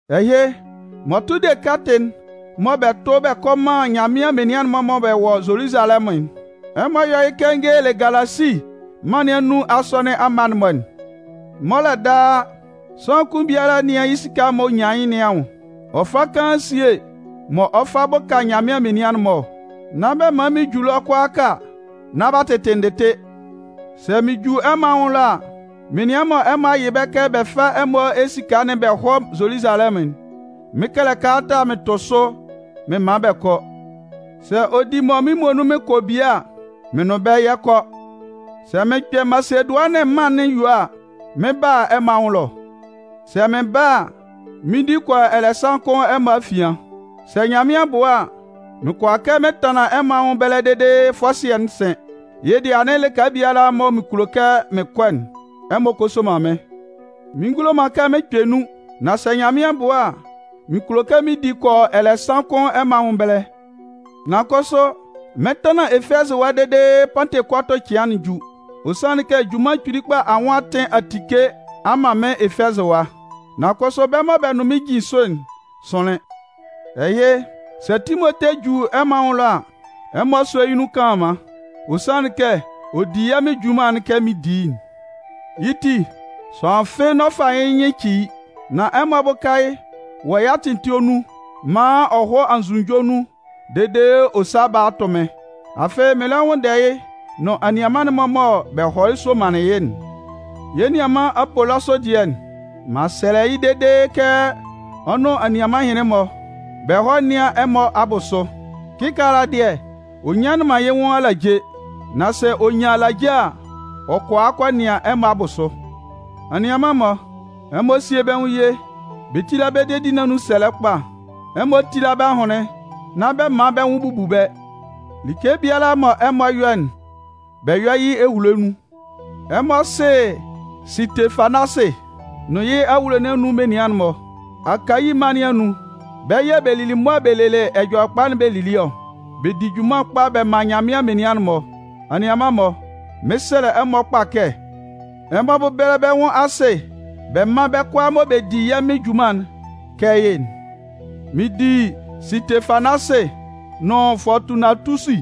Ɛhɩ, m'ɔ tʋ de kɛtɩ'n mɔ bɛ 'tʋ bɛ kɔ man Nyanmɩan menian'n-mɔ mɔ bɛ wɔ Zoluzalɛmʋn'n, ɛmɔ yɔ́ yɩ́ kɛ n gelelɩ Galasi mân nɩn anun asɔnɩn mma'n-mɔ'n. Mɔlɛ daa, sʋanlan kʋn biala nɩ́an yɩ́ esika'n m'ɔ nyan yɩ́ nɩn anwʋn, ɔ fá kaan síe mɔ ɔ 'fa bʋka Nyanmɩan menian'n-mɔ ɔ. Nán bɛ man mɩn ju ɛlɔ kʋalaaka nán b'a tɩtɩ ndɩtɩ. Sɛ mɩn ju ɛmɔ anwʋn ɛlɔ a, menian mɔ ɛmɔ a yɩ bɛ́ kɛ bɛ fá ɛmɔ esika'n bɛ hɔ́ Zoluzalɛmʋn'n, mɩn 'kɛlɛ kalata mɩn tʋ sʋ mɩn man bɛ kɔ. Sɛ ɔ di mɔ mɩ́n muonun mɩn kɔ bie a, mɩn nʋn bɛ́ yɛ 'kɔ. Sɛ mɩn kpɛ Masedʋanɩn mân'n yue a, mɩn 'ba a ɛmɔ anwʋn ɛlɔ. Sɛ mɩn ba a, mɩn 'di kɔ yɔ ɛlɛsan kʋn ɛmɔ afian. Sɛ Nyanmɩan bʋa a, mɩn kʋala kɛ mɩn tanlan ɛmɔ anwʋn ɛbɛlɛ dede fɔsɩɛ'n sɩn. Yɩ́ dɩɛ anɩn lɩka biala mɔ mɩn kulo kɛ mɩn kɔ'n, ɛmɔ kɔ soman mɩ́n. Mɩn ngulo man kɛ mɩn kpɛ nun, nan sɛ Nyanmɩan bʋa, mɩn kulo kɛ mɩn di kɔ yɔ ɛlɛsan kʋn ɛmɔ anwʋn ɛbɛlɛ. Nan kʋsʋ mɩn 'tanlan Efɛzɩ ɛwa dede Pantekɔtʋ cɩan'n ju. Ɔ sanlɩn kɛ junman kpili kpa anwʋn atɩn a tike a man mɩ́n Efɛzɩ ɛwa. Nan kʋsʋ bɛ́ mɔ bɛ nʋn mɩ́n jin sʋ'n sʋnlɩn. Ɛhɩ, sɛ Timote ju ɛmɔ anwʋn ɛlɔ a, ɛmɔ sɔ́ yɩ́ nun kanlanman. Ɔ sanlɩn kɛ ɔ di yɛ́ Mɩn junman'n kɛ mɩn di yɩ́'n. Yɩ́ ti, sʋanlan fɩ́ɩ́ n'ɔ fa yɩ́ nyɩn ci yɩ́. Nan ɛmɔ bʋ́ka yɩ́ wɔ yɩ́ atɩn etue nun maan ɔ hɔ́ anzʋnunjɔ nun dede ɔ sá bála tʋ́ mɩ́n. Afɩ mɩn lɛ nwʋnndɛ yɩ́ nʋn anianman'n-mɔ mɔ bɛ hɔlɩ somanlɩn yɩ́'n. Yɛ́ nianman Apolɔsʋ dɩɛ, m'an sɛlɛ yɩ́ dede kɛ ɔ nʋn anianman ɛhɩnlɩn-mɔ, bɛ hɔ́ nɩ́an ɛmɔ abʋsʋ. Kɩkaala dɩɛ, ɔ nyanlɩn man yɩ́ nwʋn alaje. Nan sɛ ɔ nyan alaje a, ɔ 'kɔ a nɩan ɛmɔ abʋsʋ. Anianman-mɔ, ɛmɔ síe bɛ́ nwʋn ye, bɛ tíla bɛ́ dedi nɩn anun sɛlɛ kpa. Ɛmɔ tíla bɛ́ ahʋnlɩn, nán bɛ man bɛ́ nwʋn bubu bɛ́. Like biala mɔ ɛmɔ 'yɔ'n, bɛ yɔ́ yɩ́ ehulo nun. Ɛmɔ sɩ Sɩtefanasɩ nʋn yɩ́ awulo nɩn anun menian'n-mɔ. Akayi mân nɩn anun, bɛ́ yɛ̂ bɛ lili mʋa bɛ lelɩ Ɛjɔlɛkpa'n bɛ lili ɔ. Bɛ di junman kpa bɛ man Nyanmɩan menian'n-mɔ. Anianman-mɔ, mɩɩn sɛlɛ ɛmɔ kpa kɛ ɛmɔ bɛ́bɛlɛ bɛ́ nwʋn asɩ bɛ mán bɛ́ kʋalaa mɔ bɛ di yɛ́ Mɩn junman'n kɛ yɩ́'n. Mɩn di Sɩtefanasɩ nʋn Fɔɔtunatusi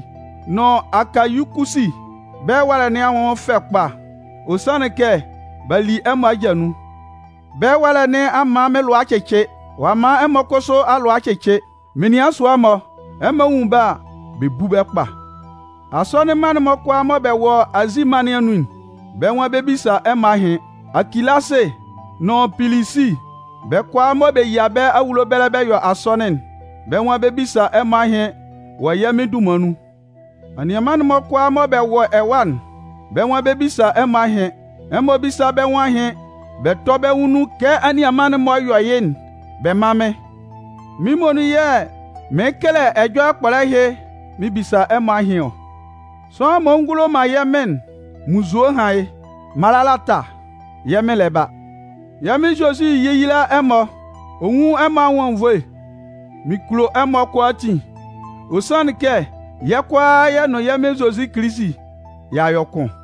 nʋn Akayikusi bɛ́ ɛwalɛ nɩn anwʋn fɛ kpa. Ɔ sanlɩn kɛ b'a li ɛmɔ aja nun. Bɛ́ ɛwalɛ nɩn a man mɩ́n lʋa a cɩcɩ, ɔ'a man ɛmɔ kʋsʋ alʋa a cɩcɩ. Menian sʋa-mɔ, ɛmɔ nwun bɛ́ a, bɛ bú bɛ́ kpa. Asɔnɩn mma'n-mɔ kʋalaa mɔ bɛ wɔ Azi mân nɩn anun'n, bɛ́ nwan bɛ 'bisa ɛmɔ ahɩn. Akilasɩ nʋn Pilisi, bɛ́ kʋalaa mɔ bɛ yia bɛ́ awulo ɛbɛlɛ bɛ yɔ asɔnɩn'n, bɛ́ nwan bɛ 'bisa ɛmɔ ahɩn wɔ yɛ́ Mɩn dunman nun. Anianman'n-mɔ kʋalaa mɔ bɛ wɔ ɛwa'n, bɛ́ nwan bɛ 'bisa ɛmɔ ahɩn. Ɛmɔ bísa bɛ́ nwʋn ahɩn bɛ tɔ́ bɛ́ nwʋn nun kɛ anianman-mɔ yɔ yɩ́'n bɛ mán mɩ́n. Mɩ́n muonun yɛ̂ mɩɩn kɛlɛ ɛjɔlɛ kpɔlɛ ɛhɩ mɩn bisa ɛmɔ ahɩn ɔ. Sʋanlan m'ɔ ngulo man yɛ́ Mɩn'n, munnzue hán yɩ́! Malanata, yɛ́ Mɩn lɛ ba. Yɛ́ Mɩn Zozi yéyila ɛmɔ, ɔ nwún ɛmɔ anwʋn anwunnvoe. Mɩn kulo ɛmɔ kʋalaatin, ɔ sanlɩn kɛ yɛ́ kʋalaa yɛ nʋn yɛ́ Mɩn Zozi Kilisi y'a yɔ kʋn.